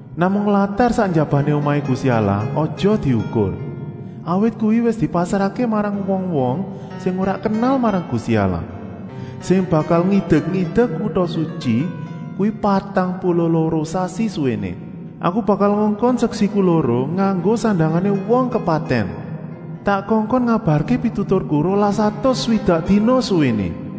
Namung latar sak njabané omahé Gusti Allah aja diukur, awit kuwi wis dipasrahké marang wong-wong sing ora kenal marang Gusti Allah, sing bakal ngidek-idek kuta sutyi kuwi patang puluh loro sasi suwéné. Aku bakal ngongkon seksiku loro nganggo sandangané wong kepatèn. Tak kongkon ngabarké pituturku rolas atus swidak dina suwéné.”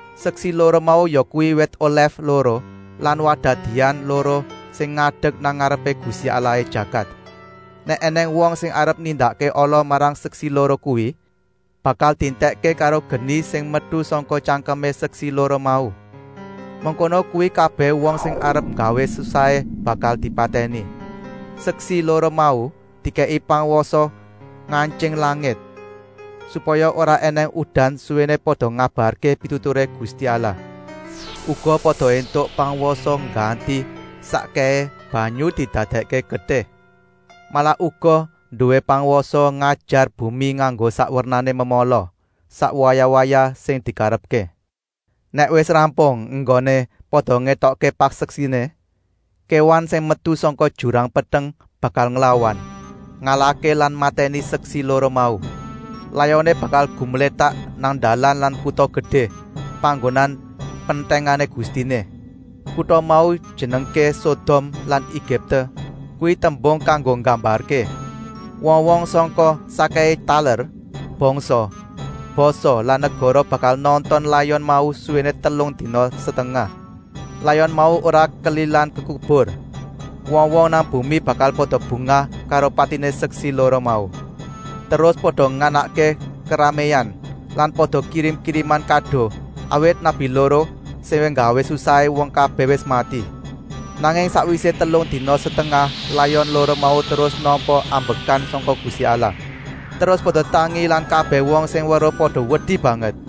Seksi loro mau yakuwi wit olèf loro lan wadah dian loro sing ngadek nang ngarepé Gusti Allahé jagat. Nèk ènèng wong sing arep nindakké ala marang seksi loro kuwi, bakal dientèkké karo geni sing metu sangka tyangkemé seksi loro mau. Mengkono kuwi kabèh wong sing arep nggawé susahé bakal dipatèni. Seksi loro mau dikèki pangwasa ngantying langit, supaya ora ènèng udan suwéné pada ngabarké pituturé Gusti Allah. Uga pada éntuk pangwasa ngganti sakkèhé banyu didadèkké getih. Malah uga nduwé pangwasa ngajar bumi nganggo sak wernané memala, sak wayah-wayah sing dikarepké. Nèk wis rampung enggoné pada ngetokké paseksiné, kéwan sing metu sangka jurang peteng bakal nglawan, ngalahké lan matèni seksi loro mau. Layoné bakal gumlétak nang dalan nang kuta gedé, panggonan pentèngané Gustiné. Kuta mau dijenengké Sodom lan Egipte, kuwi tembung kanggo nggambarké. Wong-wong sangka sakkèhé taler, bangsa, basa lan negara bakal nonton layon mau suwéné telung dina setengah. Layon mau ora kelilan dikubur. Wong-wong nang bumi bakal pada bungah karo patiné seksi loro mau. Terus pada nganakké keraméan lan pada kirim-kiriman kado, awit nabi loro sing nggawé susahé wong kabèh wis mati. Nanging sakwisé telung dina setengah layon loro mau terus nampa ambekan sangka Gusti Allah. Terus pada tangi lan kabèh wong sing weruh pada wedi banget.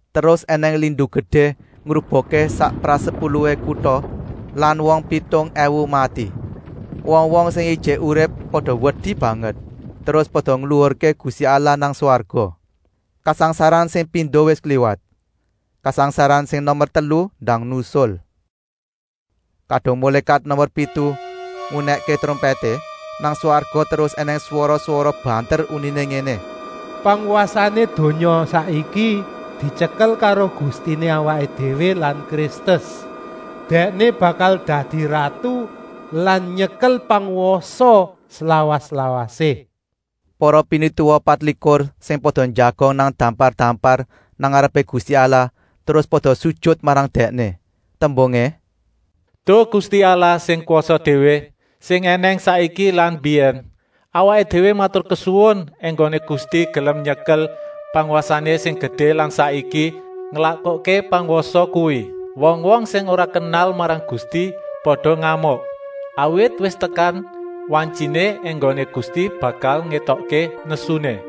Terus ènèng lindu gedé ngrubuhké sak prasepuluhé kuta lan wong pitung èwu mati. Wong-wong sing ijik urip pada wedi banget, terus pada ngluhurké Gusti Allah nang swarga. Kasangsaran sing pindo wis kliwat. Kasangsaran sing nomer telu ndang nusul. Kadung mulékat nomer pitu ngunèkké trompèté, nang swarga terus ènèng swara-swara banter uniné ngéné: “Pangwasané donya saiki dityekel karo Gustiné awaké déwé lan Kristus. Dèkné bakal dadi ratu lan nyekel pangwasa slawas-lawasé.” Para pinituwa patlikur sing pada njagong nang dampar-dampar nang ngarepé Gusti Allah terus pada sujut marang Dèkné. Tembungé: “Duh Gusti Allah sing kwasa déwé, sing ènèng saiki lan mbiyèn, Awaké déwé maturkesuwun enggoné Gusti gelem nyekel pangwasané sing gedé lan saiki nglakokké pangwasa kuwi. Wong-wong sing ora kenal marang Gusti pada ngamuk, awit wis tekan wantyiné enggoné Gusti bakal ngetokké nesuné.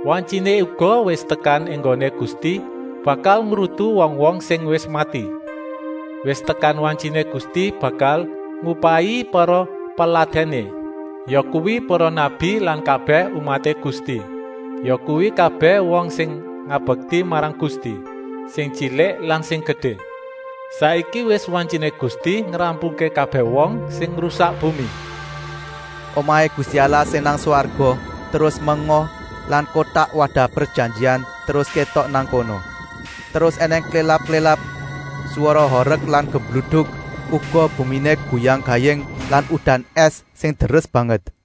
Wantyiné uga wis tekan enggoné Gusti bakal ngrutu wong-wong sing wis mati. Wis tekan wantyiné Gusti bakal ngupahi para peladèné, yakuwi para nabi lan kabèh umaté Gusti, yakuwi kabèh wong sing ngabekti marang Gusti, sing tyilik lan sing gedé. Saiki wis wantyiné Gusti ngrampungké kabèh wong sing ngrusak bumi.” Omahé Gusti Allah sing nang swarga terus menga lan Kotak Wadah Prejanjian terus kétok nang kono. Terus ènèng klélap-klélap, swara horek lan gumluduk, uga buminé goyang-gaying lan udan ès sing deres banget.